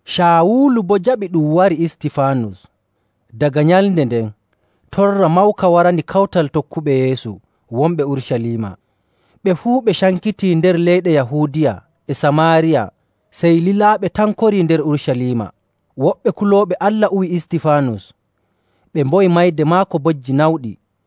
Caawulu boo jaɓii ɗum wari Istifaanus. No Caawulu Torriri Kawtal Tokkuɓe Yeesu Daga nyalnde nden, torra mawka warani kawtal tokkuɓe Yeesu wonɓe Urucaliima. Ɓe fuu ɓe cankitii nder leyɗe Yahuudiya e Samaariya, sey lilaaɓe tan korii nder Urucaliima. Woɓɓe kulooɓe Allah uwi Istifaanus, ɓe mboyani mayde maako bojji nawɗi.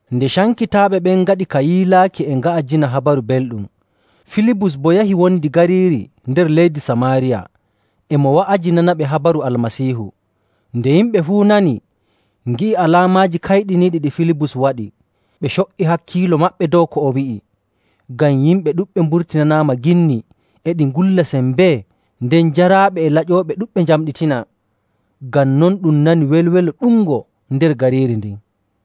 Nden cankitaaɓe ngaɗi ka yiilaaki e nga'ajina Habaru Belɗum. Filibus boo yahi wondi gariiri nder leydi Samaariya, e mo wa'ajinanaɓe habaru Almasiihu. Nde yimɓe fuu nani, ngi'i alaamaaji kayɗiniiɗi ɗi Filibus waɗi, ɓe co''i hakkiilo maɓɓe dow ko o wi'i. Ngam yimɓe ɗuɗɓe mburtinanaama ginni e ɗi ngulla sembee, nden jaraaɓe e laƴooɓe ɗuɗɓe njamɗitinaa. Ngam non ɗum nani welwelo ɗuɗngo nder gariiri ndin.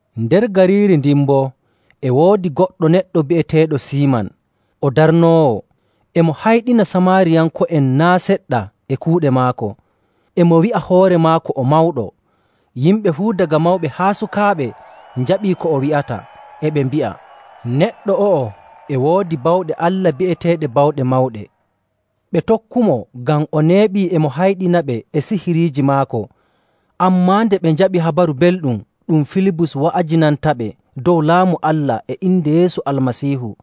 Nder gariiri ndin boo e woodi goɗɗo neɗɗo bi'eteeɗo Siiman, o darnoowo. E mo hayɗina Samaariyanko'en naa' seɗɗa e kuuɗe maako, e mo wi'a hoore maako o mawɗo. Yimɓe fuu daga mawɓe haa sukaaɓe njaɓii ko o wi'ata, e ɓe mbi'a, “Neɗɗo o'o e woodi bawɗe Allah bi'eteeɗe Bawɗe Mawɗe.” Ɓe tokkumo ngam o neeɓii e mo hayɗinaɓe e sihiriiji maako. Ammaa nde ɓe njaɓi Habaru Belɗum ɗum Filibus wa'ajinantaɓe dow Laamu Allah e inde Yeesu Almasiihu,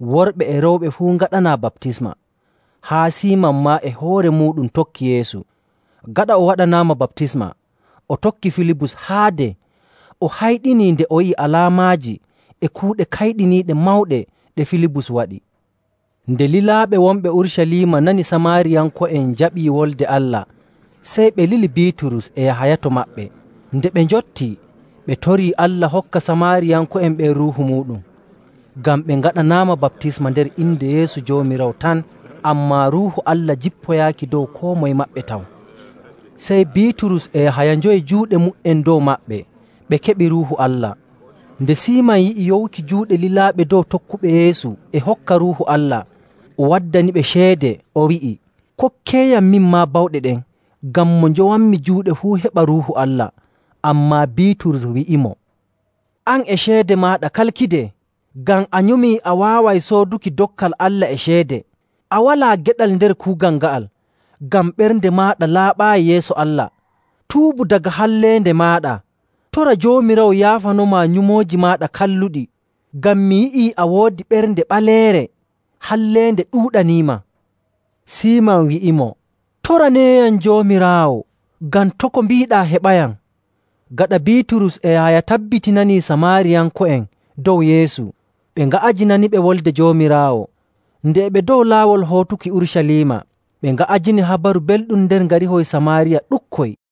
worɓe e rewɓe fuu ngaɗanaa baptisma. Haa Siiman maa e hoore muuɗum tokki Yeesu. Gaɗa o waɗanaama baptisma, o tokki Filibus haade, o hayɗinii nde o yi'i alaamaaji e kuuɗe kayɗiniiɗe mawɗe ɗe Filibus waɗi. Nde lilaaɓe wonɓe Urucaliima nani Samaariyanko'en njaɓii Wolde Allah, sey ɓe lili Biiturus e Yahaya to maɓɓe. Nde ɓe njottii, ɓe torii Allah hokka Samaariyanko'en ɓen Ruuhu muuɗum, ngam ɓe ngaɗanaama baptisma nder inde Yeesu Joomiraawo tan, ammaa Ruuhu Allah jippoyaaki dow koo moye maɓɓe taw. Sey Biiturus e Yahaya njowi juuɗe mu''en dow maɓɓe, ɓe keɓi Ruuhu Allah. Nde Siiman yi'i yowuki juuɗe lilaaɓe dow tokkuɓe Yeesu e hokka Ruuhu Allah, o waddaniɓe ceede, o wi'i, “Kokkeeyam, min maa bawɗe ɗen, ngam mo njowanmi juuɗe fuu heɓa Ruuhu Allah.” Ammaa Biiturus wi'imo, “An e ceede maaɗa kalkidee, ngam a nyumii a waaway sooduki dokkal Allah e ceede! A walaa geɗal nder kuugal nga'al, ngam ɓernde maaɗa laaɓaayi yeeso Allah. Tuubu daga halleende maaɗa, tora Joomiraawo yaafanomaa nyumooji maaɗa kalluɗi. Ngam mi yi'ii a woodi ɓernde ɓaleere, halleende ɗuuɗaniima.” Siiman wi'imo, “Toraneeyam Joomiraawo, ngam to' ko mbiiɗaa heɓayam.” Gaɗa Biiturus e Yahaya tabbitinanii Samaariyanko'en dow Yeesu, ɓe nga'ajinaniɓe Wolde Joomiraawo. Nde e ɓe dow laawol hootuki Urucaliima, ɓe nga'ajini Habaru Belɗum nder ngarihoy Samaariya ɗuɗkoy.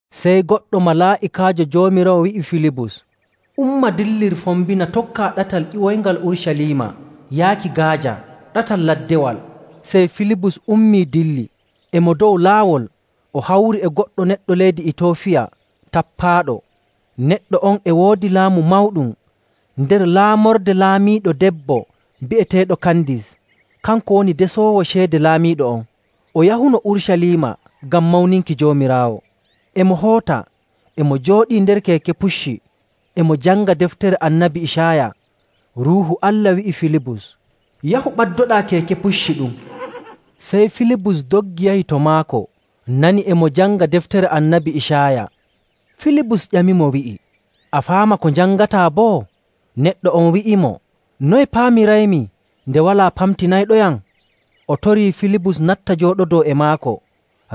Sey goɗɗo malaa'ikaajo Joomiraawo wi'i Filibus, “Umma dillir fombina tokkaa ɗatal ƴiwoyngal Urucaliima yaaki Gaaja, ɗatal laddewal.” Sey Filibus ummii dilli. E mo dow laawol o hawri e goɗɗo neɗɗo leydi Itiyoofiya tappaaɗo.: Waato ɓujaaɗo. Neɗɗo on e woodi laamu mawɗum nder laamorde laamiiɗo debbo bi'eteeɗo Kandis. Kanko woni desoowo ceede laamiiɗo on. O yahuno Urucaliima ngam mawninki Joomiraawo. E mo hoota, e mo jooɗii nder keeke pucci, e mo janga deftere Annabi Icaaya. Ruuhu Allah wi'i Filibus, “Yahu, ɓaddoɗaa keeke pucci ɗum.” Sey Filibus doggi yahi to maako, nani e mo janga deftere Annabi Icaaya. Filibus ƴamimo, wi'i, “A faama ko njangataa boo?” Neɗɗo on wi'imo, “Noye paamiraymi nde walaa pamtinayɗoyam?” O torii Filibus natta jooɗodoo e maako.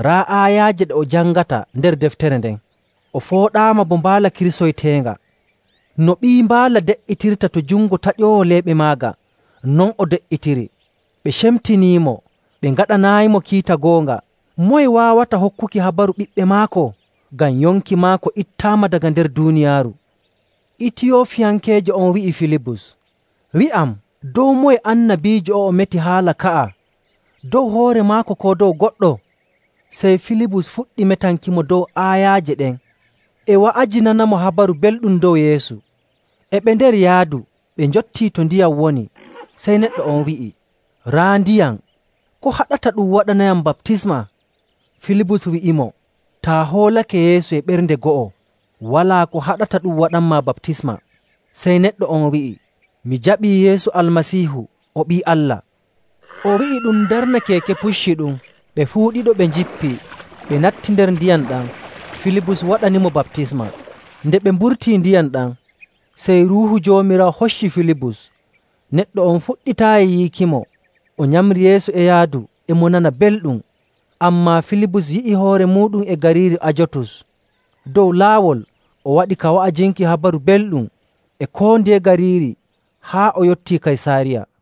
Raa aayaaje ɗe o jangata nder deftere nden: “O fooɗaama bo mbaala kirsoyteenga. No ɓii mbaala de''itirta to jungo taƴoowo leeɓe maaga, non o de''itiri. Ɓe cemtinimo, ɓe ngaɗanaayimo kiita goonga. Moye waawata hokkuki habaru ɓiɓɓe maako? Ngam yonki maako ittaama daga nder duuniyaaru.”. Itiyoofiyankeejo on wi'i Filibus, “Wi'am dow moye annabiijo o'o meti haala ka'a, dow hoore maako koo dow goɗɗo?” Sey Filibus fuɗɗi metankimo dow aayaaje ɗen, e wa'ajinanamo Habaru Belɗum dow Yeesu. E ɓe nder yaadu ɓe njottii to ndiyam woni. Sey neɗɗo on wi'i, “Raa ndiyam! Ko haɗata ɗum waɗanayam baptisma?” [Filibus wi'imo, “Taa hoolake Yeesu e ɓernde go'o, walaa ko haɗata ɗum waɗanmaa baptisma.” Sey neɗɗo on wi'i, “Mi jaɓii Yeesu Almasiihu o Ɓii Allah.”] O wi'i ɗum darna keeke pucci ɗum. Ɓe fuu ɗiɗo ɓe njippii, ɓe natti nder ndiyam ɗam. Filibus waɗanimo baptisma. Nde ɓe mburtii ndiyam ɗam, sey Ruuhu Joomiraawo hocci Filibus. Neɗɗo on fuɗɗitaayi yi'ukimo, o nyamri yeeso e yaadu, e mo nana belɗum. Ammaa Filibus yi'i hoore muuɗum e gariiri Ajotus. Dow laawol o waɗi ka wa'ajinki Habaru Belɗum e koo ndiye gariiri haa o yottii Kaysaariya.